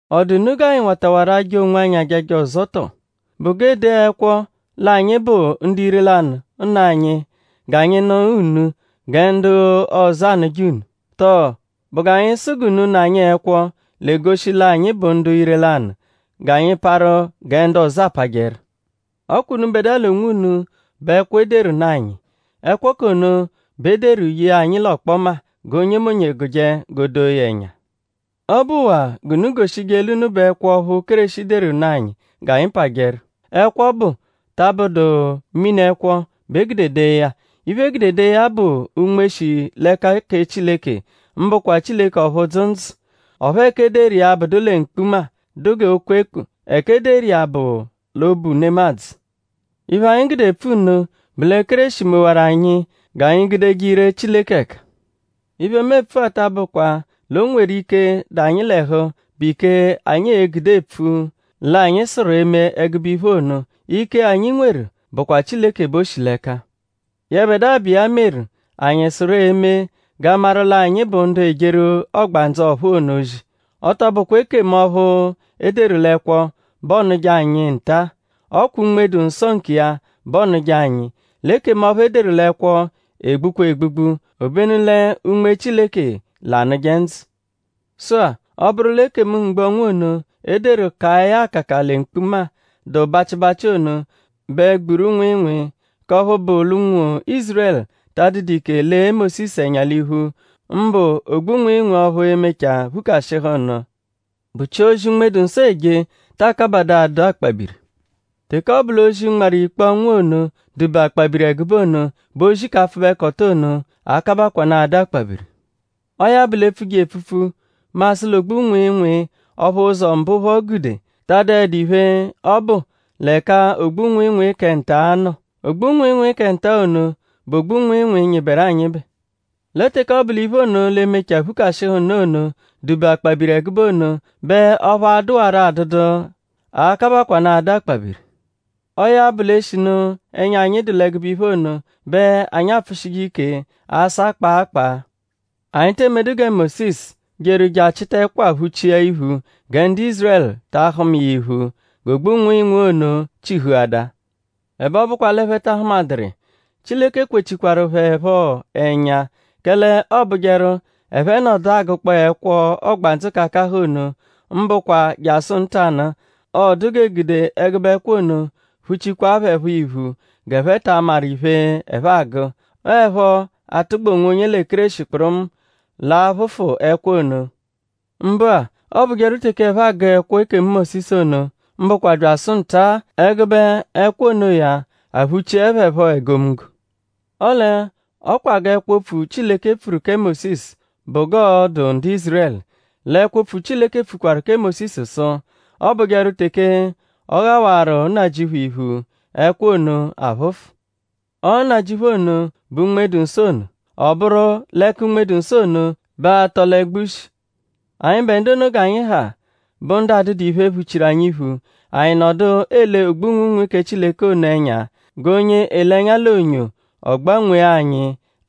?Ọ dụ unu g'anyi watawarụ aja onwanyi ajaja ọzo tọ??Bụ g'e dee ẹkwo l'anyi bụ ndu ire-lanụ nụ anyi g'anyi nụ unu gẹ ndu ọzo anụje unu? Tọo?Bụ g'anyi sụ g'unu nụ anyi ẹkwo, l'egoshi l'anyi bụ ndu ire-lanụ g'anyi parụ gẹ ndu ọzo apajẹru? Ọ kwa unubẹdua l'onwunu bụ ẹkwo, e deru nụ anyi. Ẹkwo k'ono bẹ e deru ye anyi l'ọkpoma g'onyemonye gụje g'o doo ya ẹnya. Ọ bụwaa g'unu goshije l'unu bụ ẹkwo ọphu Kéreshi deru nụ anyi g'anyi pajẹru. Ẹkwo ọbu ta abụdu mini-ẹkwo bẹ e gude dee ya. Iphe, e gude dee ya bụ Unme, shi l'ẹka kẹ Chileke; mbụkwa Chileke ọphu dzụ ndzụ. Ọphu ẹka e deru iya abụdu lẹ mkpuma, dụ g'okwekpu; ẹka e deru iya bụ l'obu nemadzụ. Iphe, anyi gude epfu nno bụ lẹ Kéreshi mewaru anyi g'anyi gudeje ire Chileke ẹka. Iphe, mu epfu-a ta abụkwa l'o nweru ike, dụ anyi l'ẹhu, bụ ike, anyi e-gude epfu l'anyi sụru eme ẹgube iphe ono. Ike, anyi nweru bụkwa Chileke bẹ o shi l'ẹka; yẹbedua, bụ iya meru anyi sụru eme g'a maru l'anyi bụ ndu ejeru Ọgbandzu ọ̀phúú ono ozi. Ọ tọ bụkwa ekemu ọphu e deru l'ẹkwo bẹ ọonuje anyi nta-a. Ọ kwa Unme-dụ-Nsọ nkiya bẹ ọonuje anyi. L'ekemu ọphu e deru l'ẹkwo egbukwa egbugbu; obenu lẹ Unme Chileke l'anụje ndzụ. Sụ-a; ọ bụru l'ekemu mgbu-ọnwu ono e deru kaa ya akaka lẹ mkpuma, dụ bachịbachi ono bẹ gburu nwịinwii; k'ọphu bụ lẹ ụnwu Ízurẹlu ta adụdu ike lee Mósisu ẹnya l'iphu; mbụ ogbu nwịinwii ọphu e-mechaa phukashịhu nụ; bụchia ozi Unme-dụ-Nsọ eje taa kabadaa adụ akpabiri? Teke ọ bụ l'ozi, nmarụ ikpe-ọnwu ono dụ-be akpabiri ẹgube ono bẹ ozi k'apfụbekoto ono a-kabakwanụ adụ akpabiri. Ọo ya bụ; l'e -pfuje iya epfupfu; mu asụ l'ogbu-nwịinwii ọphu ụzo mbụ phọ gude ta adụedu iphe, ọ bụ l'ẹka ogbu-nwịinwii kẹ nta-a nọ. Ogbu-nwịinwii kẹ nta-a ono bụ ogbu-nwịinwii, nyịberu anyịbe. Lẹ teke ọ bụ l'iphe ono, l'e-mechaa phukashịhu nụ ono dụ-be akpabiri ẹgube ono bẹ ọphu a-dụwaro adụdu a-kabakwanụ adụ akpabiri. Ọo ya bụ l'e -shinu ẹnya anyi dụ l'ẹgube iphe ono bẹ anyi apfụshije ike asa kpaa kpaa. Anyi te emedu gẹ Mósisu, jeru je achịta ẹkwa phuchia iphu gẹ ndu Ízurẹlu ta ahụma iya iphu g'ogbu-nwịinwii ono chihuada. Ẹbe ọ bụkwa l'ẹphe ta ahụmaduru iya; Chileke kwechikwaru phẹ phọ ẹnya; kẹle ọobujeru ẹphe -nọdu agụkpoo ẹkwo ọgbandzu k'akahụ ono; mbụkwa jasụ ntanụ-a; ọodu g'e gude ẹgube ẹkwa ono phuchikwaa phẹ phọ iphu g'ẹphe ta amaru iphe, ẹphe agụ. Ọo 'ẹpho atụgba onwonye lẹ Kéreshi kpụrumu l'a-phụfu ẹkwa ono. Mbụ-a; ọobujeru teke ẹphe agụ ẹkwo ekemu Mósisu ono; mbụkwa byasụ nta-a; ẹgube ẹkwa onoya aphụchie phẹ phọ egomunggo. Ọle ọ kwaa g'ẹkwo-opfu Chileke pfuru kẹ Mósisu bụ g'ọo-dụ ndu Ízurẹlu; l'ẹkwo-opfu Chileke pfukwaru kẹ Mósisu sụ: “Ọobujeru teke ọ ghawarụ Nnajịuphu iphu; ẹkwa ono aphụfu.” Ọo Nnajịuphu ono bụ Unme-dụ-Nsọ ono. Ọ bụru l'ẹka Unme-dụ-Nsọ ono bẹ atọ l'ẹgbu shi. Anyịbe ndu ono g'anyi ha bụ ndu adụdu iphe, phuchiru anyi iphu; anyi nọdu ele ogbu-nwịinwii kẹ Chileke ono ẹnya g'onye ele ẹnya l'onyo; ọ gbanwee anyi;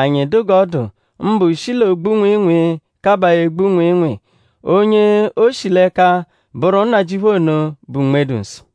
anyi dụ g'ọ dụ; mbụ shi l'ogbu nwịinwii kaba egbu nwịinwii. Onye o shi l'ẹka bụru Nnajịuphu ono, bụ Unme-dụ-Nsọ.